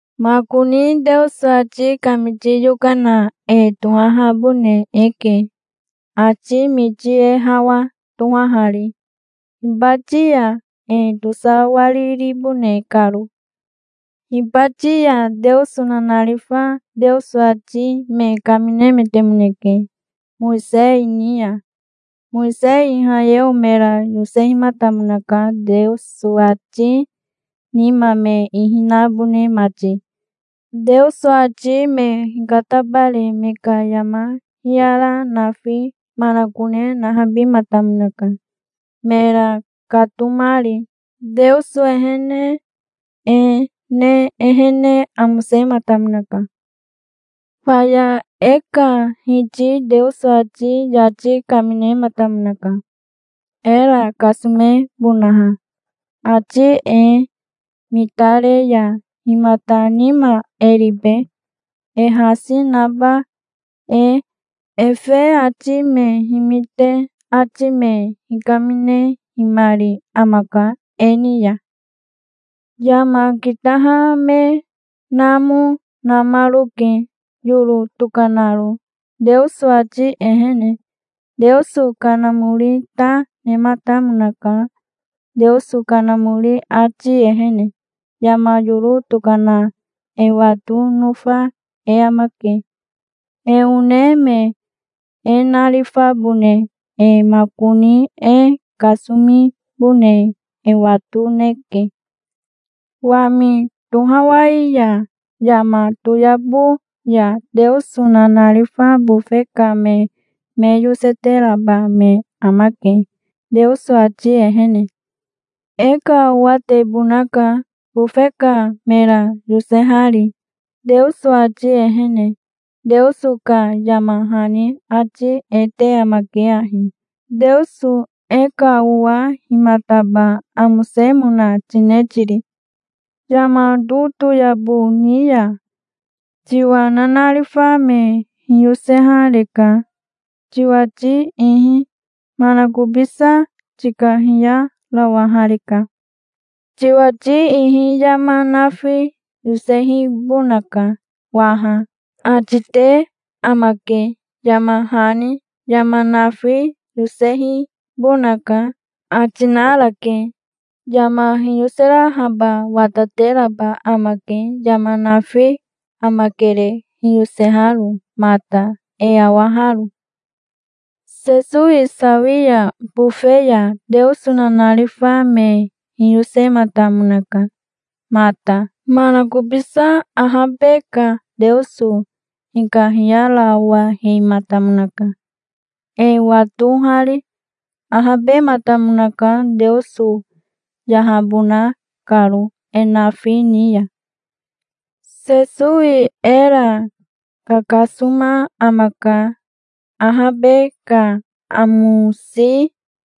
Makoni Teoso ati kamiti yokana e tohahabone eke, ati miti e hawa tohahari hibati ya, e tosawariribone karo. Hibati ya Teoso nanarifa Teoso ati me kaminemetemoneke Mowisei ni ya. Mowisei Ihayeo mera yosehimatamonaka, Teoso ati nima me ihi nabone mati. Teoso ati me hikatabare me ka yama hiyara nafi manakone nahabihimatamonaka, mera katomari. Teoso ehene e ne ehene amosematamonaka. Faya e ka Hiti Teoso ati yati kaminematamonaka, era kasomebonaha. Ati e mitare ya himata nima e ribe, e hasi naba e? Efe ati me himite ati me hikaminehimari amaka e ni ya. Yama kitaha me namo namaroke, yoro tokanaro, Teoso ati ehene. Teoso Kanamori ta, nematamonaka. Teoso Kanamori ati ehene yama yoro tokana e wato, nofa e amake, e one me e narifabone e. Makoni e kasomibone e watoneke. Wami tohawai ya yama toyabo ya Teoso nanarifa bofe ka me me yoseteraba me amake, Teoso ati ehene. E ka owatebonaka, bofe ka mera yosehari, Teoso ati ehene. Teoso ka yama hani ati e te amake ahi: "Teoso e ka owa himataba amosemona tine tiri? Yama totoyabo ni ya tiwa nanarifa me hiyosehareka, tiwati ihi. Manakobisa tikahiyarawahareka. Tiwati ihi yama nafi yosehibonaka waha", ati te amake, yama hani. Yama nafi yosehibonaka, ati narake. Yama hiyoserahaba watateraba amake. Yama nafi amakere, hiyoseharo mata, e awaharo. Sesowi sawi ya bofe ya Teoso nanarifa me hiyosematamonaka mata. Manakobisa ahabe ka Teoso hikahiyarawahematamonaka, e watohari. Ahabematamonaka, Teoso yahabona karo e nafi ni ya. Sesowi era kakasoma amaka. Ahabe ka amosi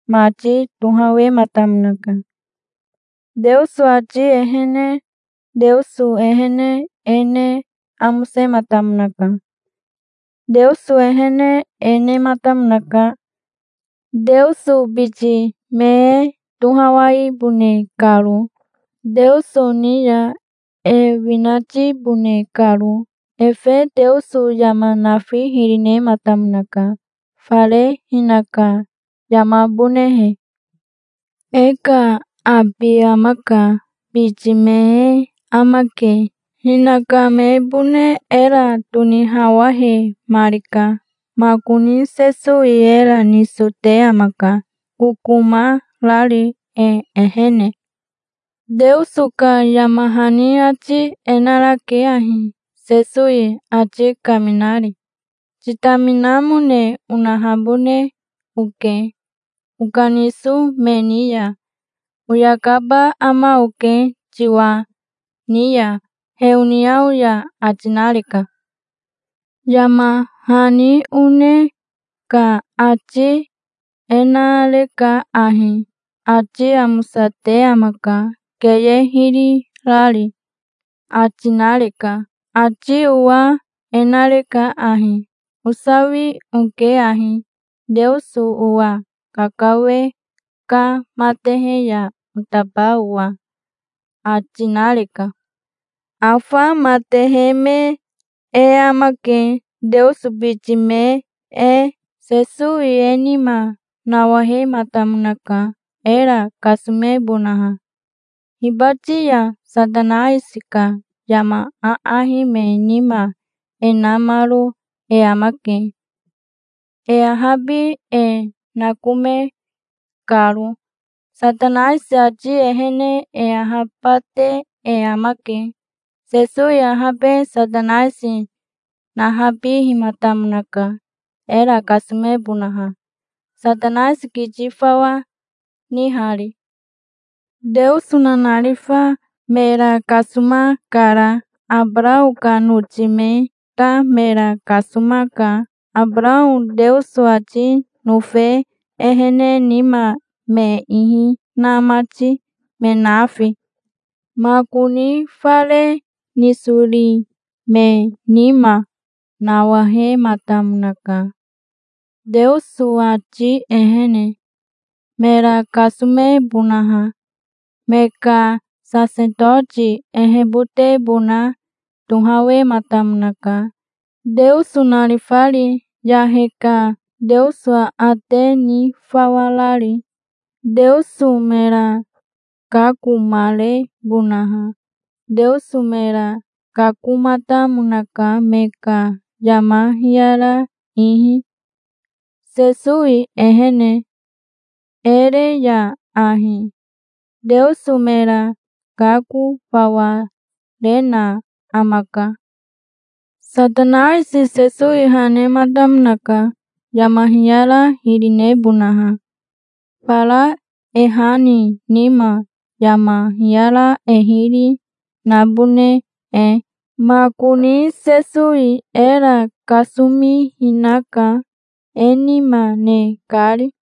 mati tohawematamonaka Teoso ati ehene. Teoso ehene e ne amosematamonaka. Teoso ehene e nematamonaka, Teoso biti me e tohawaibone karo, Teoso ni ya e winatibone karo. Efe Teoso yama nafi hiri nematamonaka, fare hinaka yamabonehe. E ka abi amaka. Biti me e amake. Hinaka mebone era tonihawahemarika. Makoni Sesowi era niso te amaka, kokoma rari e ehene. Teoso ka yama hani ati e narake ahi, Sesowi ati kaminari: "Titaminamone onahabone oke okaniso me ni ya. Oyakaba ama oke tiwa ni ya heoniao ya", ati nareka. Yama hani one ka ati e nareka ahi: "Ati amosate amaka, keye hiri rari", ati nareka. Ati owa e nareka ahi: "Osawi oke ahi, Teoso owa kakawe ka matehe ya otaba owa", ati nareka. Afa matehe me e amake, Teoso biti me e. Sesowi e nima nawahematamonaka, era kasomebonaha. Hibati ya Satanaisi ka yama aahi me nima e namaro e amake, e ahabi e nakome karo. Satanaisi ati ehene e ahabate e amake. Sesowi ahabe Satanaisi nahabihimatamonaka, era kasomebonaha, Satanaisi kiti fawa nihari. Teoso nanarifa mera kasomakara. Abarao ka noti me ta mera kasomaka, Abarao Teoso ati nofe ehene nima me ihi na mati, me nafi. Makoni fare nisori me nima nawahematamonaka Teoso ati ehene, mera kasomebonaha. Me ka sasetoti ehebotebona tohawematamonaka, Teoso narifari, yahe ka Teoso aate ni fawa rari, Teoso mera kakomarebonaha. Teoso mera kakomatamonaka me ka yama hiyara ihi. Sesowi ehene e re ya ahi Teoso mera kako fawa rena amaka. Satanaisi Sesowi ha nematamonaka yama hiyara hiri nebonaha, fara e ha ni nima, yama hiyara e hiri nabone e. Makoni Sesowi era kasomihina ka, e nima ne kari.